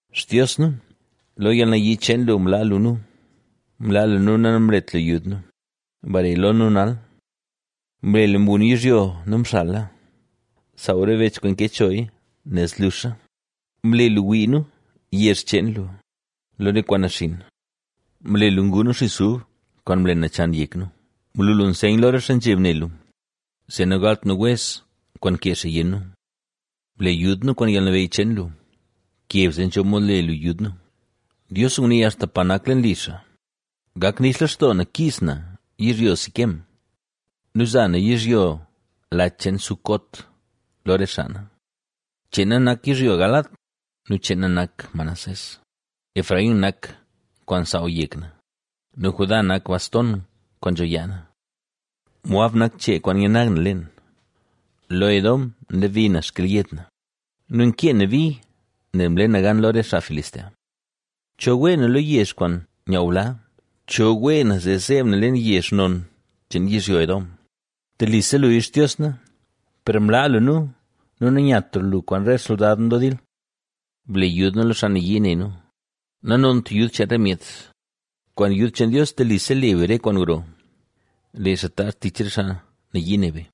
Xtios nu, lo yalnayii cheen lu mlaa lu nu, mlaa lu nu nu namlet lu yud nu; bare lo nu nal. Mle lu mgun yizhyo nu mxala; ¡saaw re bech kwaan mke choya nel zluxa! Mle lu wii nu, yezh cheen lu, lo re kwaan naxinn; mle lu ngu nu xis ub kwaan mle nachan yek nu. Mlu lu nseyn lo re xaa nzheb ne lu, zee nagalt nu wez kwaan nkee xaa yenn nu. ¡Ble yud nu kwaan yalnabeyy cheen lu! ¡Bkeb zee nzho mod le lu yud nu! Dios ngunii axta pa nak leen li xaa: “Gak nix lextoo na kiiz na yizhyo Siquem nu za na yizhyo Lach cheen Sucot lo re xaa na. Cheen na nak yizhyo Galaad nu cheen na nak Manasés; Efraín nak kwaan nsaaw yek na nu Judá nak bastona kwaan nzho yaa na. Moab nak chee kwaan nyanag na leen; lo Edom nlebi na xkelyed na nu nkee na bi nel mle na gan lo re xaa Filistea.” ¿Cho wee na lo yezh kwaan nyaaw bla? ¿Cho wee na zee zeeb na leen yezh non cheen yizhyo Edom? Telise luya Xtios na; per mlaa lu nu nu nanyatra lu kwaan re xsoldad nu lo dil. Ble yud nu lo xaa nayii ne nu, nanont yud cheen re myet. ¡Kwaan yud cheen Dios telise le be re kwaan gro; lee xaa taazh tich re xaa nayii ne be!